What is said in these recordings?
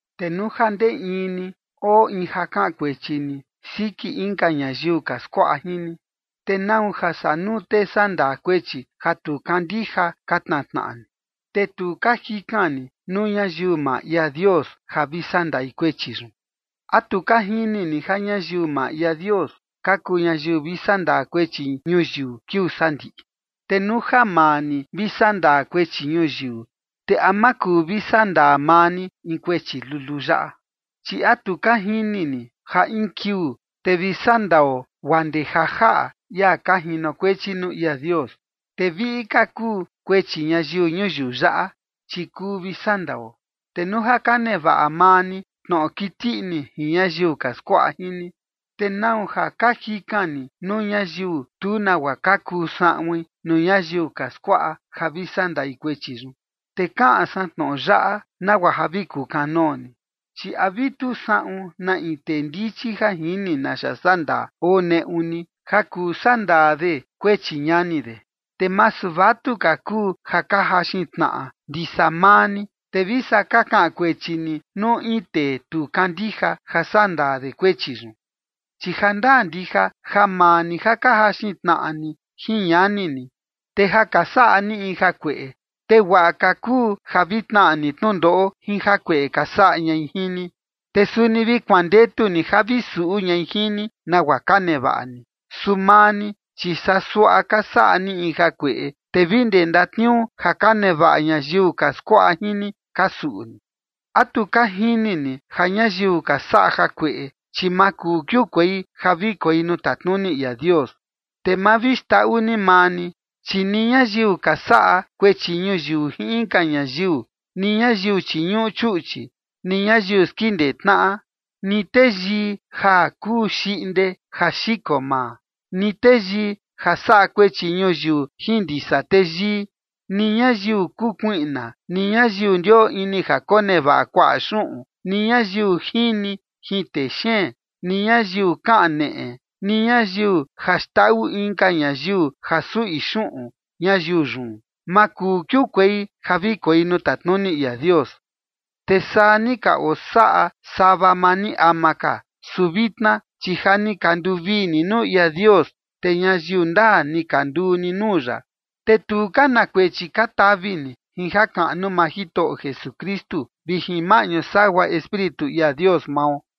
Te nuu ja ndee in ni oo in ja kaꞌan kuechi ni siki inka ñayiu ka skuaꞌa jin ni, ¿te nau ja saa nuu tee sandaa kuechi ja tu kandija ka tnaa tnaꞌa ni? Te tu ka jikan ni nuu ñayiu maa ia Dios ja vi sandai kuechi yun. ¿A tu ka jini ni ja ñayiu maa ia Dios ka kuu ñayiu vi sandaa kuechi ñuyiu kiuu sandiꞌi? Te nuu ja maa ni vi sandaa kuechi ñuyiu, ¿te a ma kuu vi sandaa maa ni in kuechi luluu yaꞌa? ¿Chi a tu ka jini ni ja in kiuu, te vi sandao guaa ndee ja jaꞌa ia ka jinokuechi nuu ia Dios? Te viꞌi ka kuu kuechi ñayiu ñuyiu yaꞌa, chi kuu vi sandao. Te nuu ja ka nevaꞌa maa ni tnoꞌo kiti ini jin ñayiu ka skuaꞌa jin ni, ¿te nau ja ka jikan ni nuu ñayiu tu nagua ka kuu saꞌuin nuu ñayiu ka skuaꞌa ja vi sandai kuechi yun? Te kaꞌan san tnoꞌo yaꞌa nagua ja vi kukanoo ni, ¿chi a vi tu saꞌun na in tee ndichi ja jini naxa sandaa oo neꞌu ni ja kuu sandaa de kuechi ñani de? Te masu vatuka kuu ja ka jaxin tnaꞌa ndisa maa ni, te vi saa ka kaꞌan kuechi ni nuu in tee tu kandija ja sandaa de kuechi yun. Chi jandaa ndija ja maa ni ja ka jaxin tnaꞌa ni jin ñani ni, te ja ka saꞌa ni in jakueꞌe. Te guaꞌa ka kuu ja vi tnaꞌa ni tnundoꞌo jin jakueꞌe ka saꞌa ñai jin ni, te suni vi kuandetu ni ja vi suꞌu ñai jin ni nagua ka nevaꞌa ni. Su maa ni, chi saa suaꞌa ka saꞌa ni in jakueꞌe, te vi ndee ndatniuu ja ka nevaꞌa ñayiu ka skuaꞌa jin ni, ka suꞌu ni. ¿A tu ka jini ni ja ñayiu ka saꞌa jakueꞌe, chi ma kuu kiukuei ja vi koi nuu tatnuni ia Dios? Te ma vi xndaꞌu ni maa ni, chi ni ñayiu ka saꞌa kuechi ñuyiu jin inka ñayiu, ni ñayiu chiñuꞌu chuꞌchi, ni ñayiu skindee tnaꞌa, ni teyii ja kuu xiꞌnde ja xiko maa, ni teyii ja saꞌa kuechi ñuyiu jin ndisa teyii, ni ñayiu kuu kuiꞌna, ni ñayiu ndioo ini ja konevaꞌa kuaꞌa xuꞌun, ni ñayiu jini jin texeen, ni ñayiu kaneꞌe, ni ñayiu ja xndaꞌu inka ñayiu ja suꞌi xuꞌun ñayiu yun, ma kuu kiukuei ja vi koi nuu tatnuni ia Dios. Te saa ni ka osaꞌa sava maa ni ama ka, su vitna, chi ja ni ka nduvii ni nuu ia Dios, te ñayiu ndaa ni ka nduu ni nuu ya, te tu ka na kuechi ka tavi ni jin jakaꞌnu maa Jitoꞌo Jesukristu vi jin maꞌñu sagua Espíritu ia Dios mao.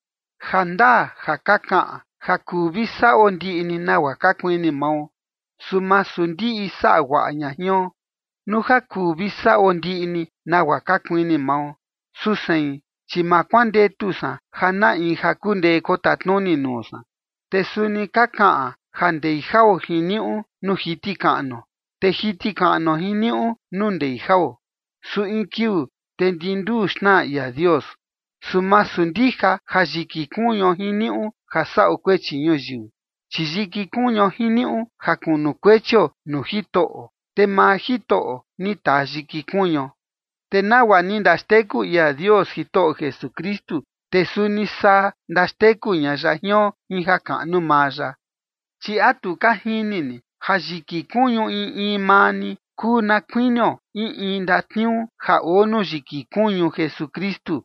Ja ndaa ja ka kaꞌan: “Ja kuu vi saꞌo ndiꞌi ni nagua ka kuini mao”. Su masu ndiꞌi saꞌa guaꞌa ña jion. Nuu ja kuu vi saꞌo ndiꞌi ni nagua ka kuini mao, su sein, chi ma kuandetu san ja na in ja kundee kotatnuni nuu san. Te suni ka kaꞌan: “Ja ndei jao jiniuꞌu nuu jiti kaꞌnuo, te jiti kaꞌnuo jiniuꞌu nuu ndei jao”. Su in kiuu, te ndi nduu xnaa ia Dios. Su masu ndija ja yiki kuñuo jiniuꞌu ja saꞌo kuechi ñuyiu, chi yiki kuñuo jiniuꞌu ja kunukuechio nuu Jitoꞌo, te maa Jitoꞌo ni taa yiki kuñuo. Te nagua ni ndaxteku ia Dios Jitoꞌo Jesukristu, te suni saa ndaxteku ña ya jion jin jakaꞌnu maa ya. Chi ¿a tu ka jini ni ja yiki kuñu in in maa ni kuu na kuinio in in ndatniuu ja oo nuu yiki kuñu Jesukristu?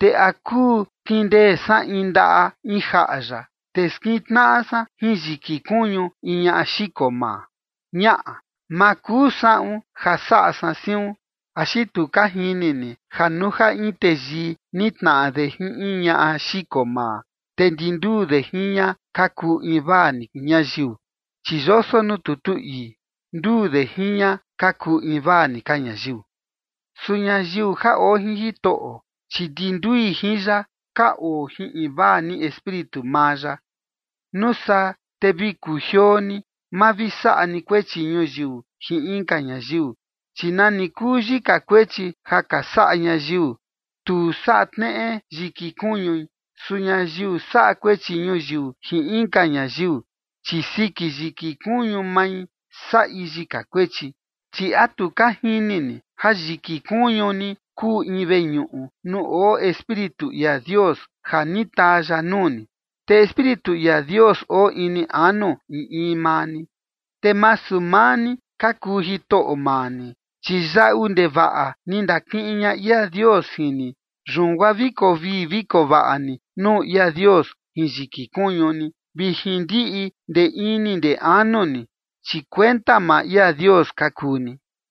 ¿Te a kuu kindee san in ndaꞌa in jaꞌa ya, te skintnaꞌa san jin yiki kuñu in ñaꞌa xiko maa? Ñaꞌa, ma kuu saꞌun ja saꞌa san siun. ¿Axi tu ka jini ni ja nuu ja in teyii nitnaꞌa de jin in ñaꞌa xiko maa, te ndi nduu de jin ña ka kuu invaa ni ñayiu? Chi yoso nuu tutu ii: “Nduu de jin ña ka kuu invaa ni ka ñayiu”. Su ñayiu ja oo jin Jitoꞌo, chi ndi ndui jin ya ka oo jin invaa ni Espíritu maa ya. Nuu saa te vi kujioo ni, ma vi saꞌa ni kuechi ñuyiu jin inka ñayiu. Chi nani kuu yika kuechi ja ka saꞌa ñayiu, tu saꞌa tneꞌe yiki kuñui. Su ñayiu saꞌa kuechi ñuyiu jin inka ñayiu, chi siki yiki kuñu mai saꞌi yika kuechi. Chi ¿a tu ka jini ni ja yiki kuñu ni kuu in veñuꞌu nuu oo Espíritu ia Dios ja ni taa ya nuu ni, te Espíritu ia Dios oo ini anu in in maa ni? Te masu maa ni ka kuu jitoꞌo maa ni. Chi yaꞌu ndevaꞌa ni ndakiꞌin ña ia Dios jin ni. Yun guaa vi koo vii vi koo vaꞌa ni nuu ia Dios jin yiki kuñu ni vi jin ndiꞌi ndee ini ndee anu ni, chi kuenta maa ia Dios ka kuu ni.